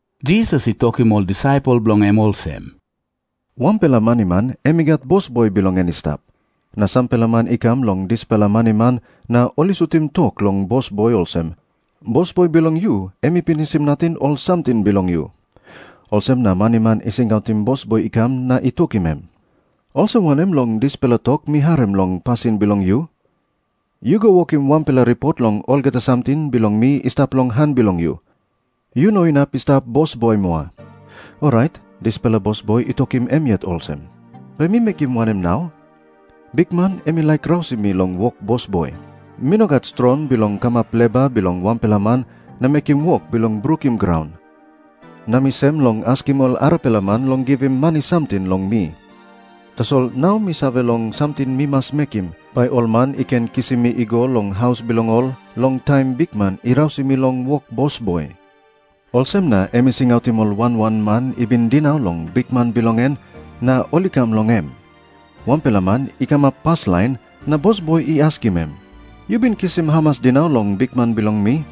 Jisas i tokim ol disaipel bilong en olsem, “Wanpela maniman em i gat bosboi bilong en i stap. Na sampela man i kam long dispela maniman na ol i sutim tok long bosboi olsem, ‘Bosboi bilong yu em i pinisim nating ol samting bilong yu.’ Olsem na maniman i singautim bosboi i kam na i tokim em, ‘Olsem wanem long dispela tok mi harim long pasin bilong yu? Yu go wokim wanpela ripot long olgeta samting bilong mi i stap long han bilong yu. Yu no inap i stap bosboi moa.’ “Orait dispela bosboi i tokim em yet olsem, ‘Bai mi mekim wanem nau? Bikman em i laik rausim mi long wok bosboi. Mi no gat strong bilong kamap leba bilong wanpela man na mekim wok bilong brukim graun. Na mi sem long askim ol arapela man long givim mani samting long mi. Tasol nau mi save long samting mi mas mekim, bai ol man i ken kisim mi i go long haus bilong ol long taim bikman i rausim mi long wok bosboi.’ Olsem na em i singautim ol wan wan man i bin dinau long bikman bilong en, na ol i kam long em. Wanpela man i kamap paslain, na bosboi i askim em, ‘Yu bin kisim hamas dinau long bikman bilong mi?’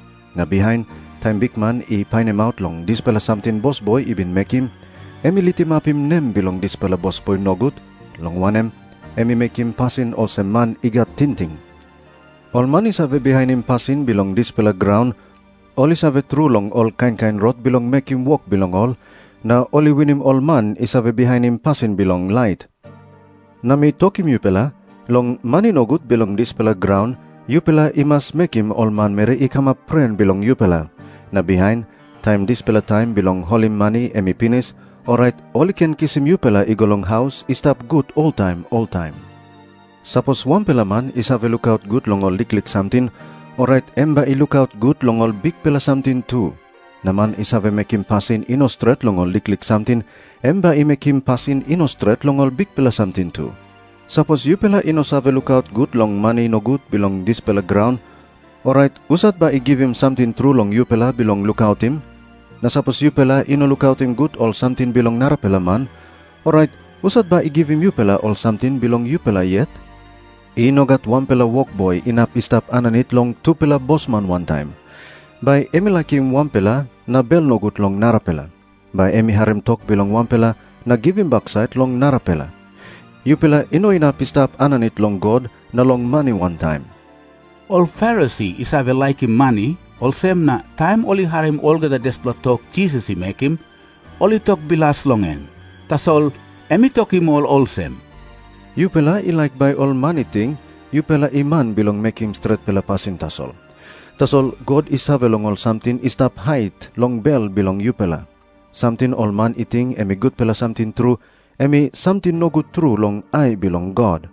“Na bihain, taim bikman i painimaut long dispela samting bosboi i bin mekim, em i litimapim nem bilong dispela bosboi nogut, long wanem, em i mekim pasin olsem man i gat tingting. Ol man i save bihainim pasin bilong dispela graun ol i save tru long ol kain kain rot bilong mekim wok bilong ol, na ol i winim ol man i save bihainim pasin bilong lait. “Na mi tokim yupela, long mani nogut bilong dispela graun yupela i mas mekim ol manmeri i kamap pren bilong yupela. Na bihain, taim dispela taim bilong holim mani em i pinis, orait ol i ken kisim yupela i go long ol haus i stap gut oltaim oltaim. “Sapos wanpela man i save lukaut gut long ol liklik samting, orait em bai i lukaut gut long ol bikpela samting tu. Na man i save mekim pasin i no stret long ol liklik samting, em bai i mekim pasin i no stret long ol bikpela samting tu. Sapos yupela i no save lukaut gut long mani nogut bilong dispela graun, orait husat bai i givim samting tru long yupela bilong lukautim? Na sapos yupela i no lukautim gut ol samting bilong narapela man, orait husat bai i givim yupela ol samting bilong yupela yet? “I no gat wanpela wokboi inap i stap aninit long tupela bosman wantaim. Bai em i laikim wanpela na bel nogut long narapela. Bai em i harim tok bilong wanpela na givim baksait long narapela. Yupela i no inap i stap aninit long God na long mani wantaim.” Ol Farisi i save laikim mani, olsem na taim ol i harim olgeta dispela tok Jisas i mekim, ol i tok bilas long em. Tasol em i tokim ol olsem, “Yupela i laik bai ol man i ting, yupela i man bilong mekim stretpela pasin tasol. Tasol God i save long ol samting i stap hait long bel bilong yupela. Samting ol man i ting em i gutpela samting tru, em i samting nogut tru long ai bilong God.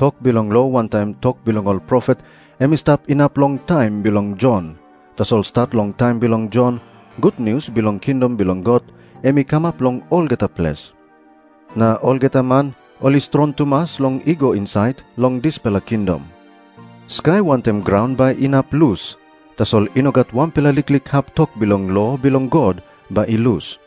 “Tok bilong lo wantaim tok bilong ol profet em i stap inap long taim bilong Jon. Tasol stat long taim bilong Jon, gutnius bilong kingdom bilong God em i kamap long olgeta ples. Na olgeta man ol i strong tumas long i go insait long dispela kingdom. “Skai wantaim graun bai inap lus. Tasol i no gat wanpela liklik hap tok bilong lo bilong God bai i lus.”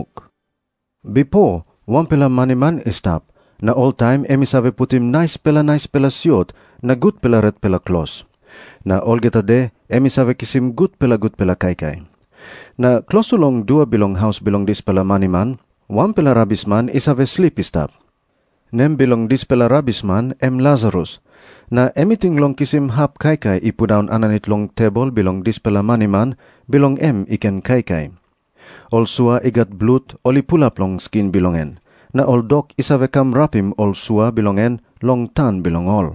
Jisas i tok moa olsem, “Bipo wanpela maniman i stap, na oltaim em i save putim naispela naispela siot na gutpela retpela klos. Na olgeta de em i save kisim gutpela gutpela kaikai. Na klostu long dua bilong haus bilong dispela maniman, wanpela rabisman i save slip i stap. Nem bilong dispela rabisman em Lasarus, na em i ting long kisim hap kaikai i pundaun aninit long tebol bilong dispela maniman, bilong em i ken kaikai. Ol sua i gat blut ol i pulap long skin bilong en, na ol dok i save kam rapim ol sua bilong en long tang bilong ol.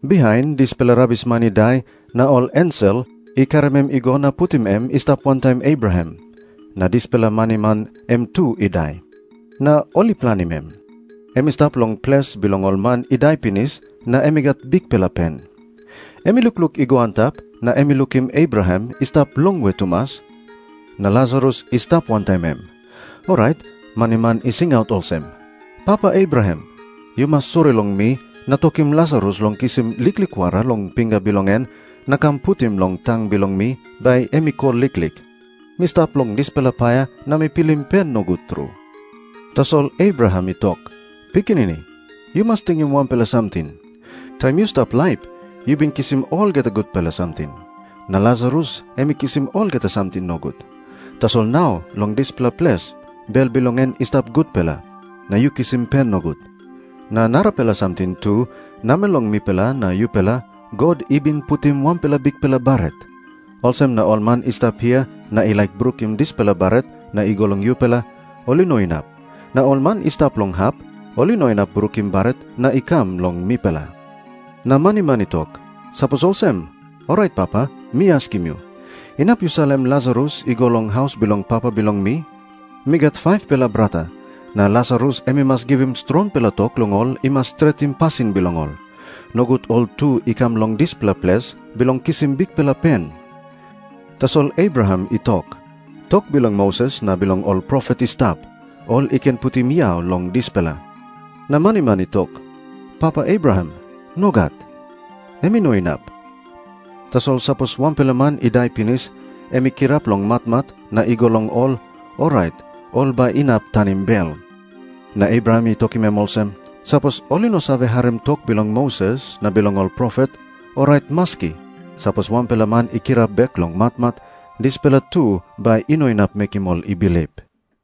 “Bihain dispela rabisman i dai, na ol ensel i karim em i go na putim em i stap wantaim Abraham. Na dispela maniman em tu i dai, na ol i planim em. Em i stap long ples bilong ol man i dai pinis na em i gat bikpela pen. Em i lukluk i go antap, na em i lukim Abraham i stap longwe tumas, na Lasarus i stap wantaim em. Orait maniman i singaut olsem, ‘Papa Abraham, yu mas sori long mi na tokim Lasarus long kisim liklik wara long pinga bilong en na kam putim long tang bilong mi bai em i kol liklik. Mi stap long dispela paia na mi pilim pen nogut tru.’ “Tasol Abraham i tok, ‘Pikinini, yu mas tingim wanpela samting. Taim yu stap laip, yu bin kisim olgeta gutpela samting. Na Lasarus em i kisim olgeta samting nogut. Tasol nau long dispela ples, bel bilong en i stap gutpela. Na yu kisim pen nogut. Na narapela samting tu. Namel long mipela na yupela God i bin putim wanpela bikpela baret. Olsem na ol man i stap hia na i laik brukim dispela baret na i go long yupela, ol i no inap. Na ol man i stap long hap, ol i no inap brukim baret na i kam long mipela.’ “Na maniman i tok, ‘Sapos olsem, orait papa, mi askim yu, inap yu salim Lasarus i go long haus bilong papa bilong mi. Mi gat 5-pela brata. Na Lasarus em i mas givim strongpela tok long ol i mas stretim pasin bilong ol. Nogut ol tu i kam long dispela ples bilong kisim bikpela pen.’ Tasol Abraham i tok, ‘Tok bilong Moses na bilong ol profet i stap. Ol i ken putim yau long dispela.’ Na maniman i tok, ‘Papa Abraham, nogat. Em i no inap. Tasol sapos wanpela man i dai pinis, em i kirap long matmat na i go long ol, orait ol bai inap tanim bel.’ “Na Abraham i tokim em olsem, ‘Sapos ol i no save harim tok bilong Moses na bilong ol profet, orait maski sapos wanpela man i kirap bek long matmat, dispela tu bai i no inap mekim ol i bilip.’”